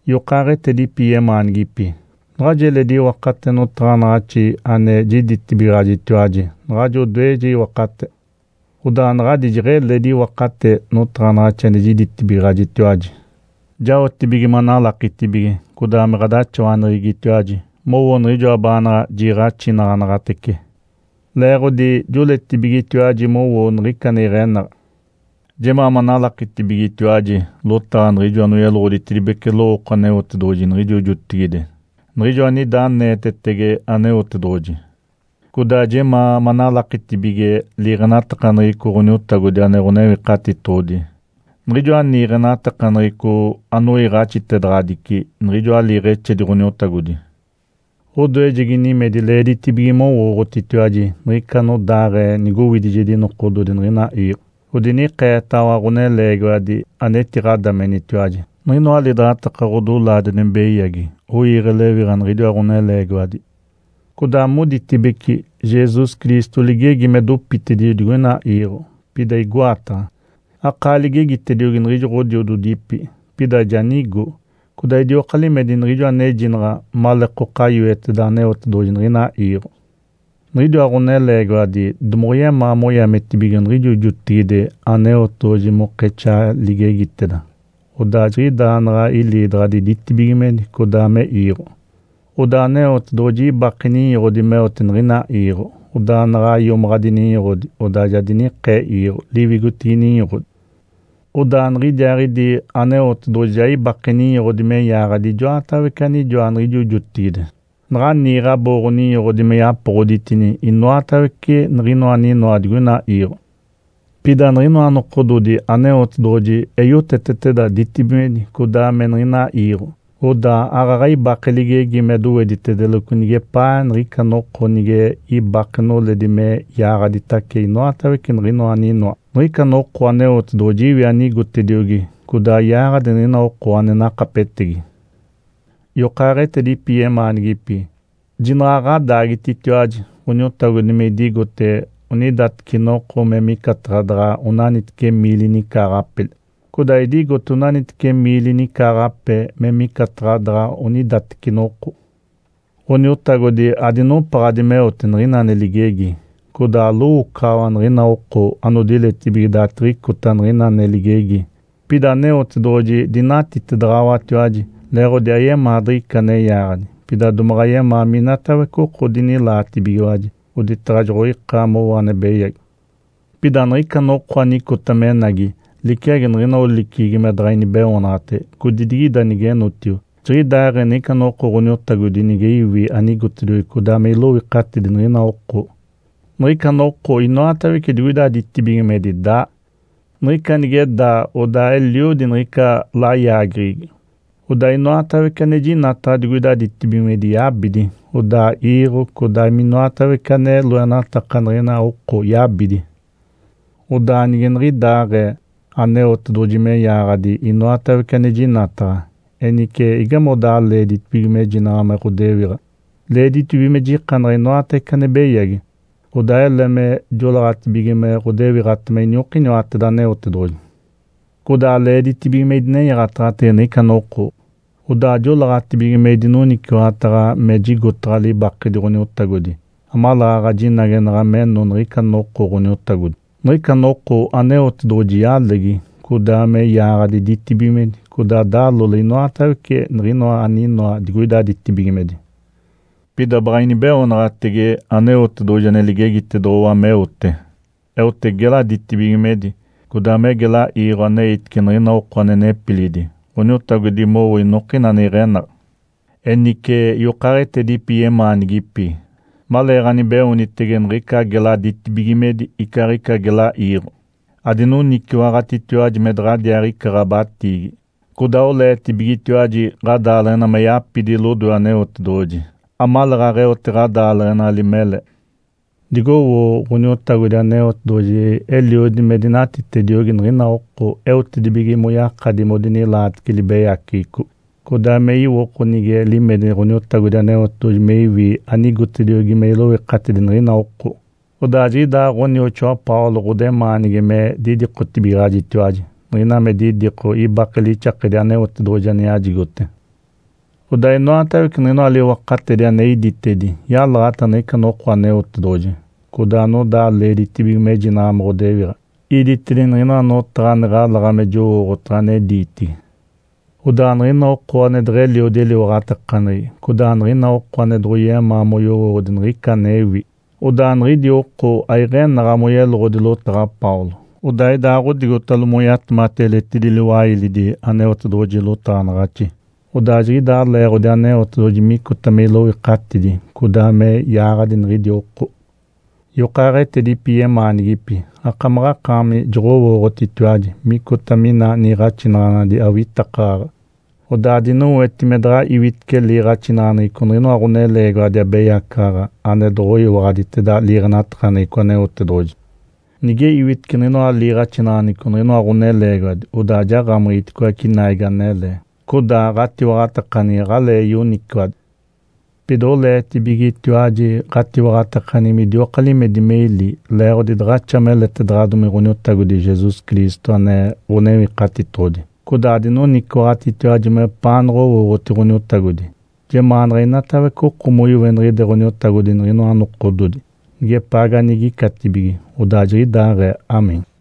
Yokaaɡ̶etedipi yemaanigipi, naɡ̶ajo eledi iwakate notaɡ̶anaɡ̶axi ane jiditibigaɡ̶ajitiwaji naɡ̶ajo odoeje iwakate. Odaa naɡ̶adi jeɡ̶eledi iwakate notaɡ̶anaɡ̶axi ane jiditibigaɡ̶ajitiwaji, jaotibige manalakitibige codaa me ɡ̶adaxawaneɡ̶egitiwaji mowoo niɡ̶ijoa baanaɡ̶a jiiɡ̶axinaɡ̶anaɡ̶atece, leeɡ̶odi joɡ̶oleetibigetiwaji mowoo niɡ̶ica ane iɡ̶enaɡ̶a. Jemaa manalakitibigetiwaji lotaɡ̶a niɡ̶ijo anoyeloɡ̶oditedibece lowooko Aneotedoɡ̶oji niɡ̶ijo jotigide, niɡ̶ijo anida aneetetege Aneotedoɡ̶oji. Codaa jemaa manalakitibige liiɡ̶enatakaneɡ̶eco Ǥoniotagodi ane Ǥonewikatitoɡ̶odi, niɡ̶ijoa niiɡ̶enatakaneɡ̶eco anoiiɡ̶axitedaɡ̶adici niɡ̶ijoa liiɡ̶exedi Ǥoniotagodi. Odoejegi nimedi leeditibige mowooɡ̶otitiwaji niɡ̶ica anodaaɡ̶ee nigowidijedi nokododi niɡ̶ina iiɡ̶o, odinikeetaɡ̶awa ɡ̶oneleegiwadi anetiɡ̶adamenitiwaji. Niɡ̶inoa lidaɡ̶ataka ɡ̶odolaadi ane beyagi oiiɡ̶e lewiɡ̶a niɡ̶idiwa ɡ̶oneleegiwadi. Codaa moditibece, “Jesus Cristo ligegi me dopitedijo digoina iiɡ̶o. Pida igoataɡ̶a? Akaa ligegitediogi niɡ̶ijo ɡ̶odiododipi, pida ja nigo, codaa idioka limedi niɡ̶ijo anejinaɡ̶a maleekoka yoeteda Aneotedoɡ̶oji niɡ̶ina iiɡ̶o!” Niɡ̶idiwa ɡ̶oneleegiwadi domoɡ̶oyemaa moyaagiditibige niɡ̶ijo jotigide Aneotedoɡ̶oji mokexaa ligegiteda, odaa jiɡ̶idaaɡ̶ee naɡ̶a iliidaɡ̶adi ditibigimedi codaa me iiɡ̶o. Odaa Aneotedoɡ̶oji ibake ninyoɡ̶odi meote niɡ̶ina iiɡ̶o. Odaa naɡ̶a iomaɡ̶adi ninyoɡ̶odi, odaa ja dinikee iiɡ̶o liwigotinigi ninyoɡ̶odi. Odaa niɡ̶idiaaɡ̶idi Aneotedoɡ̶oji ja ibake ninyoɡ̶odi me yaaɡ̶adi ijoatawece anijoa niɡ̶ijo jotigide naɡ̶a niiɡ̶e abooɡ̶o-ninyoɡ̶odi me yapoɡ̶oditedini inoatawece niɡ̶inoa aninoa digoina iiɡ̶o. Pida niɡ̶inoa nokododi Aneotedoɡ̶oji eyoteteteda ditibigimedi codaa me niɡ̶ina iiɡ̶o. Odaa aaɡ̶aɡ̶a ibake ligegi me doweditedeloco nigepaa niɡ̶ica noko nige ibake noledi me yaaɡ̶aditace inoatawece niɡ̶inoa aninoa. Niɡ̶ica noko Aneotedoɡ̶oji iwi anigotediogi, codaa yaaɡ̶adi niɡ̶ina oko ane nakapetegi. Yokaaɡ̶etedipi yemaanigipi, jinaɡ̶a ɡ̶adaagititiwaji Ǥoniotagodi me idigote onidateci noko me micataɡ̶a daɡ̶a onaniteci miili nicaaɡ̶ape, codaa idigote onaniteci miili nicaaɡ̶ape me micataɡ̶a daɡ̶a onidateci noko. Ǥoniotagodi adinopaɡ̶adi meote niɡ̶ina ane ligegi, codaa alowoocaɡ̶awa niɡ̶ina oko anodiletibige daaditiɡ̶icota niɡ̶ina ane ligegi. Pida Aneotedoɡ̶oji dinatitedaɡ̶awatiwaji, leeɡ̶odi ayemaa diɡ̶ica ane yaaɡ̶adi, pida domaɡ̶a yemaa minatawece oko dinilaatibigiwaji, oditaɡ̶a joɡ̶oika mowo ane beyagi. Pida niɡ̶ica noko anicota menagi liciagi niɡ̶ina oliceɡ̶egi me daɡ̶a inibeoonaɡ̶atege, codidigida nigenotio. Jiɡ̶idaaɡ̶ee niɡ̶ica noko Ǥoniotagodi nige iwi anigotediogi codaa me iloikatidi niɡ̶ina oko. Niɡ̶ica noko inoatawece digoida ditibigimedi daa. Niɡ̶ica nige daa odaa eliodi niɡ̶ica layaageɡ̶egi. Odaa inoatawece anejinataɡ̶a digoida ditibigimedi yabidi, odaa iiɡ̶o codaa minoatawece ane loenataka niɡ̶ina oko yabidi. Odaa nige niɡ̶idaaɡ̶ee Aneotedoɡ̶oji me yaaɡ̶adi inoatawece ane jinataɡ̶a. Enice, igamodaa leeditibige mejinaɡ̶a me ɡ̶odewiɡ̶a? Leeditibige me jikanaɡ̶a inoatawece ane beyagi, odaa ele me joleeɡ̶atibige me ɡ̶odewiɡ̶atema iniokiniwateda Aneotedoɡ̶oji. Codaa leeditibige me idinenyaɡ̶ataɡ̶atege niɡ̶ica noko, odaa joleeɡ̶atibige me idinoniciwaɡ̶ataɡ̶a me jigotaɡ̶a libakedi Ǥoniotagodi amaleeɡ̶aɡ̶a jinagenaɡ̶a meno niɡ̶ica noko Ǥoniotagodi. Niɡ̶ica noko Aneotedoɡ̶oji yalegi, codaa me yaaɡ̶adi ditibigimedi, codaa dalole inoatawece niɡ̶inoa aninoa digoida ditibigimedi. Pida baɡ̶a inibeoonaɡ̶atege Aneotedoɡ̶oji ane ligegitedoɡ̶owa meote. Eote gela ditibigimedi, codaa me gela iiɡ̶o aneitice niɡ̶ina oko ane nepilidi Ǥoniotagodi mowo inokina ane iɡ̶enaɡ̶a. Enice, yokaaɡ̶etedipi yemaanigipi, maleeɡ̶anibeoonitege niɡ̶ica gela ditibigimedi icaaɡ̶ica gela iiɡ̶o, adinoniciwaɡ̶atitiwaji me daɡ̶adiaaɡ̶ica ɡ̶abatiigi, codaa oleetibigetiwaji ɡ̶adaaleɡ̶ena me yapidi lodoe Aneotedoɡ̶oji amaleeɡ̶aɡ̶a eote ɡ̶adaaleɡ̶enali mele. Digowoo Ǥoniotagodi Aneotedoɡ̶oji eliodi me dinatitediogi niɡ̶ina oko eotedibige moyakadi modinilaatece libeyaceɡ̶eco, codaa me iwoko nige limedi Ǥoniotagodi Aneotedoɡ̶oji me iwi anigotediogi me iloikatidi niɡ̶ina oko. Odaa jiɡ̶idaa ɡ̶onioxoa Paulo ɡ̶odemaanigi me didikotibigaɡ̶ajitiwaji. Niɡ̶ina me didiko, ibake lixakedi Aneotedoɡ̶oji ane yajigote. Odaa inoatawece niɡ̶inoa liwakatedi ane iditedi yalaɡ̶ata niɡ̶ica noko Aneotedoɡ̶oji, codaa anodaa leeditibige mejinaɡ̶a me ɡ̶odewiɡ̶a. Iditedini niɡ̶inoa notaɡ̶a ane ɡ̶alaɡ̶a me jowooɡ̶otaɡ̶a ane diitigi. Odaa niɡ̶ina oko ane deɡ̶eliodi eliwaɡ̶atakaneɡ̶egi, codaa niɡ̶ina oko ane doɡ̶oyemaa moyowooɡ̶odi niɡ̶ica anewi, odaa niɡ̶idi oko aiɡ̶enaɡ̶a moyeloɡ̶odi lotaɡ̶a Paulo, odaa idaaɡ̶odigotalo moyatemati eletidi liwailidi Aneotedoɡ̶oji lotaɡ̶anaɡ̶axi. Odaa jiɡ̶idaa leeɡ̶odi Aneotedoɡ̶oji micota me iloikatidi codaa me yaaɡ̶adi niɡ̶idi oko. Yokaaɡ̶etedipi yemaanigipi, akamaɡ̶akaami joɡ̶owooɡ̶otitiwaji micota mina niiɡ̶axinaɡ̶anadi awitakaɡ̶aɡ̶a. Odaa adinoweti me daɡ̶a iwitece liiɡ̶axinaɡ̶aneɡ̶eco niɡ̶inoa ɡ̶oneleegiwadi abeyacaɡ̶aɡ̶a ane doɡ̶oyiwaɡ̶aditeda liiɡ̶enatakaneɡ̶eco Aneotedoɡ̶oji. Nige iwitece niɡ̶inoa liiɡ̶axinaɡ̶aneɡ̶eco niɡ̶inoa ɡ̶oneleegiwadi, odaa jaɡ̶amiɡ̶iticoace naigi anele, codaa ɡ̶atiwaɡ̶atakaneɡ̶egi aɡ̶alee yoniciwadi. Pida oleetibigetiwaji ɡ̶atiwaɡ̶atakaneɡ̶egi midioka limedi me ili leeɡ̶odi daɡ̶axa meletedoɡ̶odomi Ǥoniotagodi Jesus Cristo ane Ǥonewikatitoɡ̶odi. Codaa adinoniciwaɡ̶atitiwaji mepaanaɡ̶a owooɡ̶oti Ǥoniotagodi. Jemaanaɡ̶a inatawece oko moiweniɡ̶ide Ǥoniotagodi niɡ̶inoa nokododi, nigepaa ganigicatibige. Odaa jiɡ̶idaaɡ̶ee. (Amém).